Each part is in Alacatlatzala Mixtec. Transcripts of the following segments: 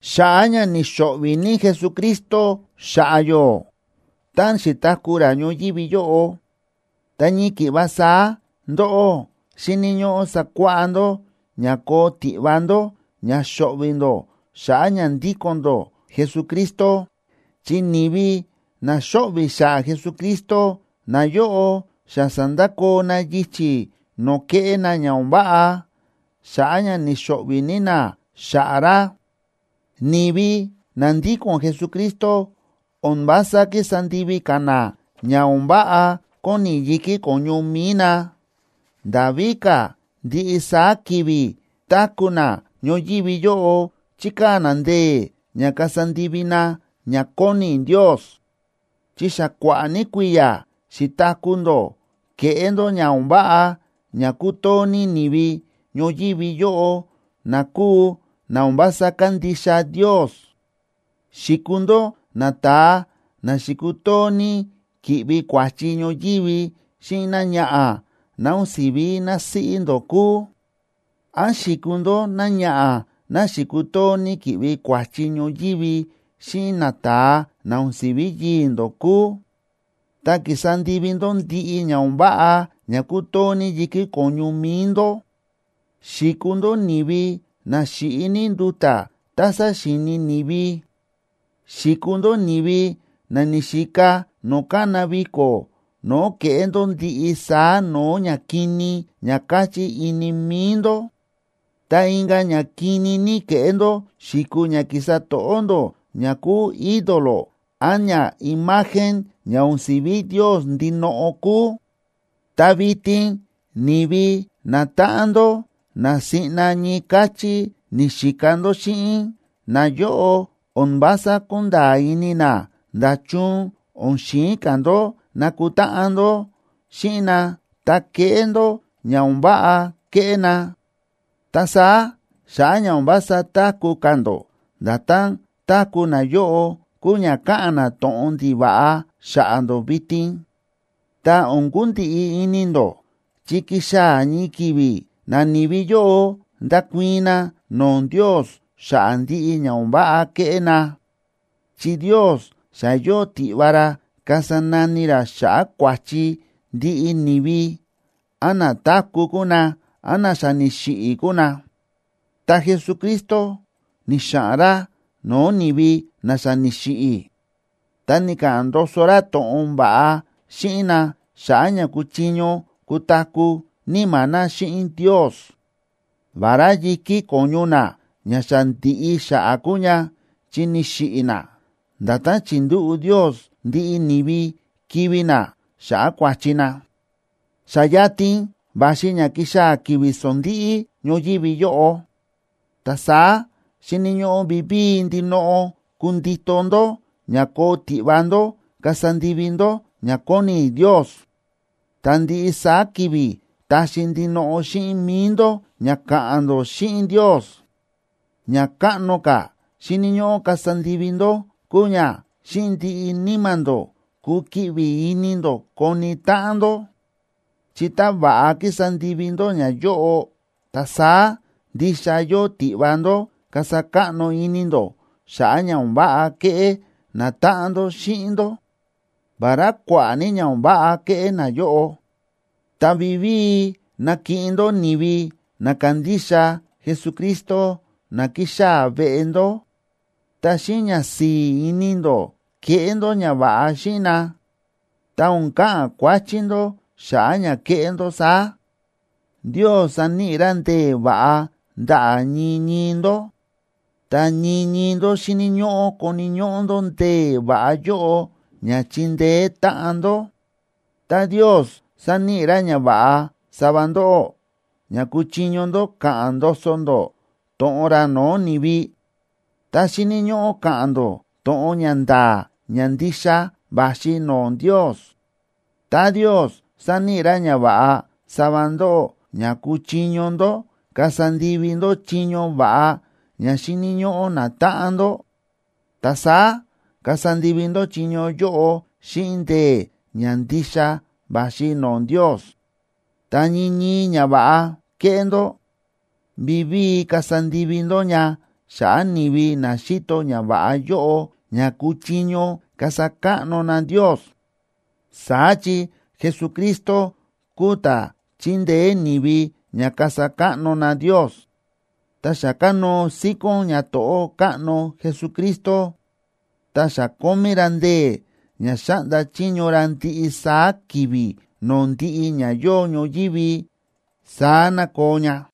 Xa̱ꞌa̱ ña ni̱xo̱ꞌvi̱ ní Jesucristo xa̱ꞌa̱ yó táꞌan xi̱taku̱ ra ñoyívi yóꞌo, ta ñii ki̱ꞌva saá ndóꞌó xíni̱ ñóꞌó sakuáꞌá ndó ña koo tiꞌva ndó ña xo̱ꞌvi̱ ndó xa̱ꞌa̱ ña ndíko̱n ndó Jesucristo. Chi ni̱vi na xóꞌvi̱ xa̱ꞌa̱ Jesucristo, nayóꞌo xa sa̱ndakoo na yichi̱ no̱o̱ kéꞌé na ña o̱n váꞌa. Xa̱ꞌa̱ ña ni̱xo̱ꞌvi̱ ní na xa̱ꞌa̱ ra, ni̱vi na ndíko̱n Jesucristo o̱n vása kísa ndivi ka̱ na ña o̱n váꞌa kóni yi̱kí ko̱ñu mi̱i na, nda̱ víka̱ ndiꞌi saá ki̱vi̱ táku̱ na ñoyívi yóꞌo chíkaa̱ na ndee̱ ña kasa ndivi na ña kóni Ndios. Chi xa kua̱ꞌa̱ ní kui̱ya̱ xi̱taku̱ ndó kéꞌé ndó ña o̱n váꞌa ña kútoo ní ni̱vi ñoyívi yóꞌo na kúu na o̱n vása kándixa Ndios. Xi̱kuu ndó nata̱a na xi̱kutoo ní ki̱ꞌvi kua̱chi ñoyívi xíꞌin náñaꞌa̱ ná o̱n si̱ví násíꞌí ndó kúu, án xi̱kuu ndó náñaꞌa̱ ná xi̱kutoo ní ki̱ꞌvi kua̱chi ñoyívi xíꞌin nata̱a na o̱n si̱ví yii̱ ndó kúu, ta ki̱sa ndivi ndó ndiꞌi ña o̱n váꞌa ña ku̱too ní yi̱kí ko̱ñu mi̱i ndó; xi̱kuu ndó ni̱vi na xi̱ꞌi ní nduta̱ tá saxíini ni̱vi; xi̱kuu ndó ni̱vi na ni̱xika no̱o̱ kána viko̱ no̱o̱ ke̱ꞌé ndó ndiꞌi saá no̱o̱ ñakini ña káchí ini mi̱i ndó; ta inka̱ ña kini ní ke̱ꞌé ndó xi̱kuu ña ki̱sa to̱ꞌó ndó ña kúu ídolo án ñaimagen ña o̱n si̱ví Ndios ndinoꞌo kúu. Ta vitin ni̱vi natáꞌan ndó na siꞌna ñii káchí ni̱xika ndó xíꞌin, nayóꞌo o̱n vása kúnda̱a̱ ini na nda̱chun o̱n xi̱in ka̱ ndó nakutáꞌan ndó xíꞌin na ta keꞌé ndó ña o̱n váꞌa kéꞌé na, ta saá xa̱ꞌa̱ ña o̱n vása táku̱ ka̱ ndó nda̱tán táku̱ nayóꞌo kúu ña káꞌa̱n na to̱ꞌon ndiva̱ꞌa xa̱ꞌa̱ ndó vitin. Ta o̱n kundiꞌi ini ndó, chi kixaa̱ ñii ki̱vi̱ nani̱vi yóꞌo ndakuii̱n na no̱o̱ Ndios xa̱ꞌa̱ ndiꞌi ña o̱n váꞌa ke̱ꞌé na, chi Ndios xa yóo tiꞌva ra kasa nani ra xa̱ꞌa̱ kua̱chi ndiꞌi ni̱vi, án na táku̱ kúu na, án na xa ni̱xiꞌi̱ kúu na. Ta Jesucristo ni̱xa̱ꞌa̱n ra no̱o̱ ni̱vi na xa ni̱xiꞌi̱, ta ni̱ka̱ꞌa̱n ndoso ra to̱ꞌon va̱ꞌa xíꞌin na xa̱ꞌa̱ ña kuchiño kutaku̱ níma̱ na xíꞌin Ndios, vará yi̱kí ko̱ñu na ña xa ndi̱ꞌi xa̱ꞌa̱ kúu ña, chi ni̱xiꞌi̱ na, nda̱tán chi̱ndúꞌu̱ Ndios ndiꞌi ni̱vi kivi̱ na xa̱ꞌa̱ kua̱chi na. Xa yatin va̱xi ña kixaa̱ ki̱vi̱ sondíꞌí ñoyívi yóꞌo. Ta saá xíni̱ ñóꞌó vivíi ndinoꞌo kundito ndó ña koo tiꞌva ndó kasa ndivi ndó ña kóni Ndios, ta ndiꞌi saá ki̱vi̱ taxi ndinoꞌo xíꞌin mi̱i ndó ña ka̱ꞌa̱n ndó xíꞌin Ndios. Ña káꞌno ka̱ xíni̱ ñóꞌó kasa ndivi ndó kúu ña xíꞌin ndiꞌi níma̱ ndó kukiꞌvi ini ndó koni táꞌan ndó, chi tá va̱ꞌa kísa ndivi ndó ñayóꞌo, ta saá ndixa yóo tiꞌva ndó kasa káꞌno ini ndó xa̱ꞌa̱ ña o̱n váꞌa ke̱ꞌé natáꞌan ndó xíꞌin ndó, vará kua̱ꞌa̱ ní ña o̱n váꞌa ke̱ꞌé nayóꞌo. Ta vivíi nakiꞌin ndó ni̱vi na kándixa Jesucristo na kixaa̱ veꞌe ndó, ta xíꞌin ñasi̱i̱ ini ndó keꞌé ndó ñava̱ꞌa xíꞌin na, ta o̱n ka̱ꞌa̱n kuáchí ndó xa̱ꞌa̱ ña kéꞌé ndó saá. Ndios sa̱níꞌi ra ndee̱ va̱ꞌa ndaꞌa̱ ñii ñii ndó, ta ñii ñii ndó xíni̱ ñóꞌó koni̱ ñóꞌó ndó ndee̱ va̱ꞌa yóꞌo ña chindeé táꞌan ndó. Tá Ndios sa̱níꞌi ra ñava̱ꞌa sava ndóꞌó ña kuchiño ndó ka̱ꞌa̱n ndoso ndó to̱ꞌon ra no̱o̱ ni̱vi, ta xíni̱ ñóꞌó ka̱ꞌa̱n ndó to̱ꞌon ña nda̱a̱ ña ndixa va̱xi no̱o̱ Ndios. Tá Ndios sa̱níꞌi ra ñava̱ꞌa sava ndóꞌó ña kuchiño ndó kasa ndivi ndó chiño va̱ꞌa ña xíni̱ ñóꞌó natáꞌan ndó, ta saá kasa ndivi ndó chiño yóꞌo xíꞌin ndee̱ ña ndixa va̱xi no̱o̱ Ndios. Ta ñii ñii ñava̱ꞌa kéꞌé ndó, vivíi kasa ndivi ndó ña xa̱ꞌa̱ ni̱vi na xíto ñava̱ꞌa yóꞌo ña kuchiño kasa káꞌno na Ndios, saá chi Jesucristo kúu ta̱ chíndeé ni̱vi ña kasa káꞌno na Ndios. Ta xa kánóo síkón ñato̱ꞌó káꞌno Jesucristo, ta xa kómí ra ndee̱ ña xáꞌnda chiño ra ndiꞌi saá ki̱vi̱ no̱o̱ ndiꞌi ña yóo ñoyívi. Saá ná koo ña.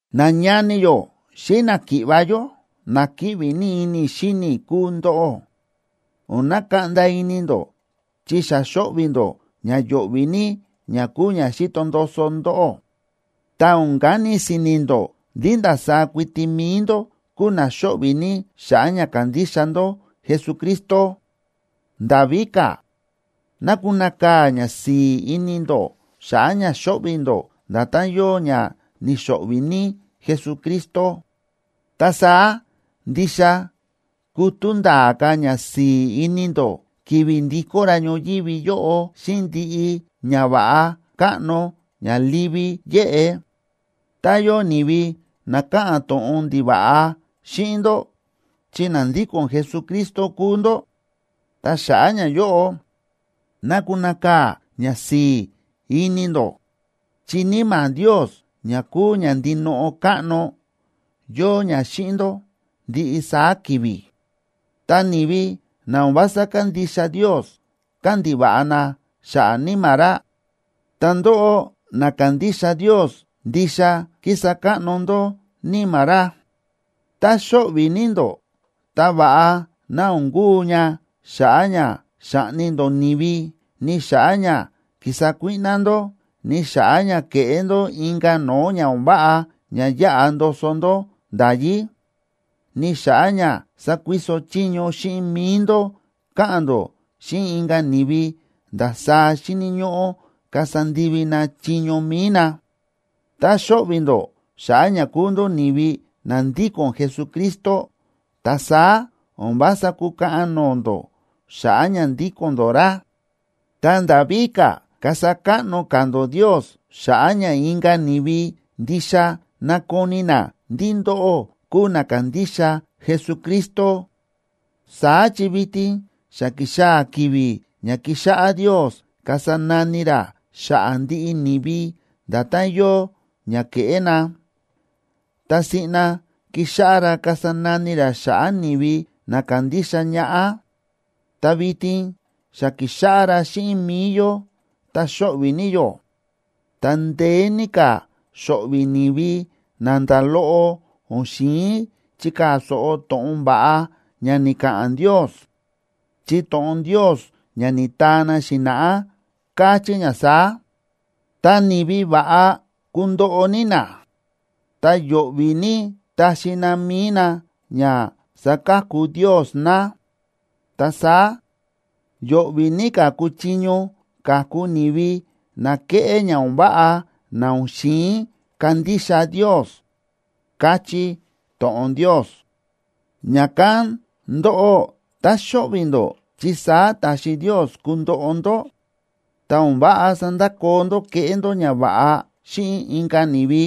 Nañani yó xíꞌin náki̱ꞌva̱ yó, na kíꞌvi ní ini i̱ xíni i̱ kúu ndóꞌó. O̱n nakaꞌnda ini ndó chi xa xóꞌvi̱ ndó ña yo̱ꞌvi̱ ní ña kúu ña xíto ndoso ndóꞌó, ta o̱n kani si̱ni̱ ndó ndí ndasaá kuiti mi̱i ndó kúu na xóꞌvi̱ ní xa̱ꞌa̱ ña kándixa ndó Jesucristo. Nda̱ víka̱, ná kunakaa̱ ñasi̱i̱ ini ndó xa̱ꞌa̱ ña xóꞌvi̱ ndó nda̱tán yóo ña ni̱xo̱ꞌvi̱ ní Jesucristo. Ta saá ndixa kutú nda̱a̱ ka̱ ñasi̱i̱ ini ndó ki̱vi̱ ndikó ra ñoyívi yóꞌo xíꞌin ndiꞌi ñava̱ꞌa káꞌno ña livi yéꞌe. Tá yóo ni̱vi na káꞌa̱n to̱ꞌon ndiva̱ꞌa xíꞌin ndó chi na ndíko̱n Jesucristo kúu ndó, ta xa̱ꞌa̱ ñayóꞌo ná kunakaa̱ ñasi̱i̱ ini ndó. Chi Níma̱ Ndios ña kúu ña ndinoꞌo káꞌno, yóo ña xíꞌin ndó ndiꞌi saá ki̱vi̱. Ta ni̱vi na o̱n vása kándixa Ndios káꞌa̱n ndiva̱ꞌa na xa̱ꞌa̱ Níma̱ ra, ta ndóꞌó na kándixa Ndios ndixa kísa káꞌno ndó Níma̱ ra. Tá xóꞌvi̱ ní ndó, ta va̱ꞌa ná o̱n kuu ña xa̱ꞌa̱ ña xa̱ꞌni ndó ni̱vi, ni xa̱ꞌa̱ ña ki̱sa kuíꞌná ndó, ni xa̱ꞌa̱ ña ke̱ꞌé ndó inka̱ no̱o̱ ña o̱n váꞌa ña yáꞌa ndoso ndó nda̱yí, ni xa̱ꞌa̱ ña sa̱kuiso chiño xíꞌin mi̱i ndó káꞌa̱n ndó xíꞌin inka̱ ni̱vi ndasaá xíni̱ ñóꞌó kasa ndivi na chiño mi̱i na. Tá xóꞌvi̱ ndó xa̱ꞌa̱ ña kúu ndó ni̱vi na ndíko̱n Jesucristo, ta saá o̱n vása kukaꞌan no̱o̱ ndó xa̱ꞌa̱ ña ndíko̱n ndó ra, ta nda̱ víka̱ kasa káꞌno ka̱ ndó Ndios xa̱ꞌa̱ ña inka̱ ni̱vi ndixa nakoni na ndí ndóꞌó kúu na kándixa Jesucristo. Saá chi vitin xa ki̱xaa̱ ki̱vi̱ ña kixáꞌá Ndios kasa nani ra xa̱ꞌa̱ ndiꞌi ni̱vi nda̱tán yóo ña ke̱ꞌé na, ta siꞌna kixáꞌá ra kasa nani ra xa̱ꞌa̱ ni̱vi na kándixa ñaꞌá. Tá vitin xa kíxáꞌá ra xíꞌin mi̱i yó ta xóꞌvi̱ ní yó, ta ndeé ní ka̱ xo̱ꞌvi̱ ni̱vi na nda̱ loꞌo o̱n xi̱in chikaa̱ so̱ꞌo to̱ꞌon va̱ꞌa ña ni̱ka̱ꞌa̱n Ndios. Chi to̱ꞌon Ndios ña ni̱taa na xi̱na̱ꞌá, káchí ña saá: Ta ni̱vi va̱ꞌa, kundoꞌo ní na ta yo̱ꞌvi̱ ní taxi na mi̱i na ña saka̱ku Ndios na, ta saá, yo̱ꞌvi̱ ní ka̱ kuchiño ka̱ku ni̱vi na kéꞌé ña o̱n váꞌa, na o̱n xi̱in kandixa Ndios, káchí to̱ꞌon Ndios. Ña̱kán ndóꞌó, tá xóꞌvi̱ ndó chi saá ta̱xi Ndios kundoꞌo ndó, ta o̱n váꞌa sandakoo ndó kéꞌé ndó ñava̱ꞌa xíꞌin inka̱ ni̱vi,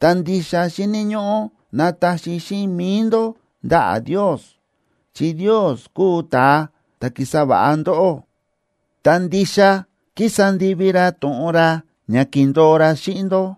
ta ndixa xíni̱ ñóꞌó nataxi xíꞌin mi̱i ndó ndaꞌa̱ Ndios, chi Ndios kúu ta̱a ta̱ ki̱sa va̱ꞌa ndóꞌó, ta ndixa kísa ndivi ra to̱ꞌon ra ña ki̱ndo̱o ra xíꞌin ndó.